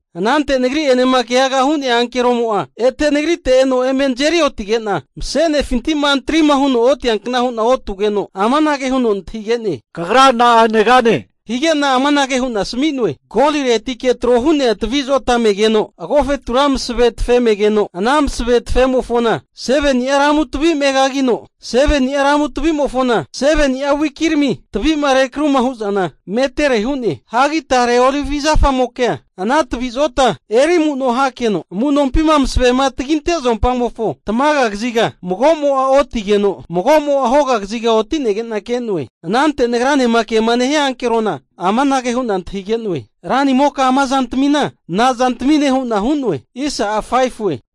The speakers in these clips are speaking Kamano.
Anante nagri'enema keaga hu'nea ankeromo'a ete nagrite eno eme nazeri otige'na mase'nefinti'ma antrima huno otiankna hu'na otugeno, amanage huno nantahige'ne, Kagra na'a negane? Hige'na amanage hu'na asmi'noe. Goliretike tro hu'nea tavi zota me'negeno, agofetura masave tafe megeno, ana masave tafemofona 7ni'a ramu tavi megagigeno, 7ni'a ramu tavimofona 7ni'a wikirami tavi'ma rekruma hu'zana metere hu'ne. Hagi tare Olivi zafamokea ana tavi zota eri amu'no hakeno amunompima masavema taginte zompamofo tamaga kaziga mago'mo'a otigeno, mago'mo'a hoga kaziga otinege'na ke'noe. Anante nagranema kema nehia ankerona amanage hu'na antahige'noe, Ranimoka ama zantamina nazantamine? hu'na hu'noe.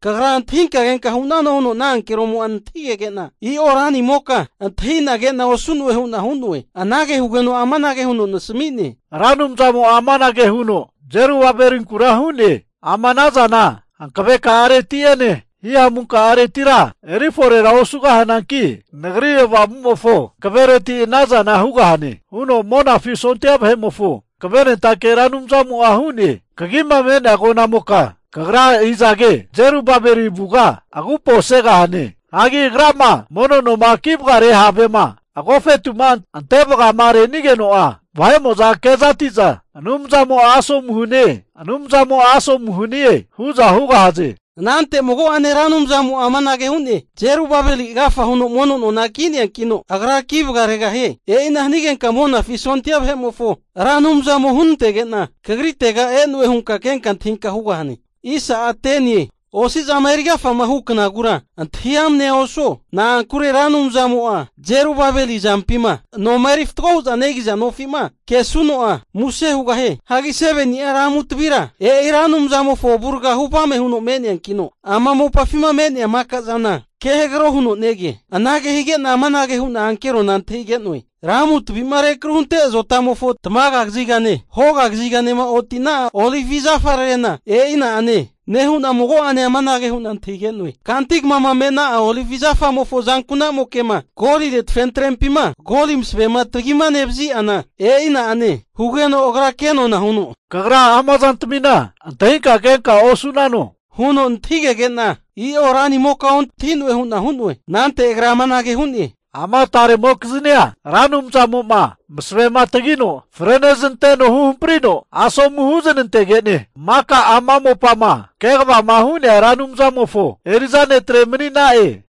Kagra antahinka kenka hu'nano huno ana ankeromo'a nantahigege'na, i'o ranimoka antahina ke'na osu'noe hu'na hu'noe. Anage hugeno amanage huno nasmi'ne, Ra Anumzamo'a amanage huno Zerubabelinkura hu'ne, ama ana zana hankaveka'areti'ene hihamuka'aretira eri forera osugahananki, Nagri Avamumofo hankavereti ana zana hugahane, huno Monafi sondia vahe'mofo hankavenentake Ra Anumzamo'a hu'ne. Kagima me'nea agonamoka kagra izage? Zerubabeli avuga agupo segahane. Hagi agrama mono noma ki vagare havema agofetuma ante vagama renigeno'a, vahe'mo'za kezati'za, Anumzamo'a asomu hanie, Anumzamo'a asomu hanie hu'za hugahaze. Anante mago'ane Ra Anumzamo'a amanage hu'ne, Zerubabeli agafa huno mono nona ki'neankino, agra ki vagaregahie. E'ina hanige'za Monafi sondia vahe'mofo Ra Anumzamo hunantege'na kagritega e'noe hu'za vahe'mo'za ke'za antahiza hugahaze. Osi'zama eri agafama hu knagura antahi amnea osuo. Na'ankure Ra Anumzamo'a Zerubabeli azampima noma eri fatgo hu'za negi'za nofi'ma kesuno'a, muse hugahie. Hagi 7ni'a ramu tavira, e'i Ra Anumzamofo avuraga huvame huno me'neankino ama mopafima me'nea maka zana ke hagro huno nege. Anage hige'na amanage hu'na ankerona antahige'noe, ramu tavi'ma rekruhunte azotamofo tamaga kazigane, hoga kaziganema oti'na'a olivi zafararena e'i na'ane? Nehu'na mago'ane amanage hu'na antahige'noe. Kanti kamama mena'a olivi zafamofo azanku'namoke'ma golire tafentrempima goli masavema tagimanevazi'ana, e'i na'ane. Hugeno agra kenona huno, Kagra ama zantamina antahinka kenka osu'nano? huno nantahigege'na, I'o ranimoka ontahi'noe hu'na hu'noe. Anante agra amanage huno hu'ne, ama tare netrena Ra Anumzamo'ma masavema tagino freneznanteno huhamprino asomu huznantege'ne maka ama mopama kegavama hu'nea Ra Anumzamofo eri'za netre mani'na'e.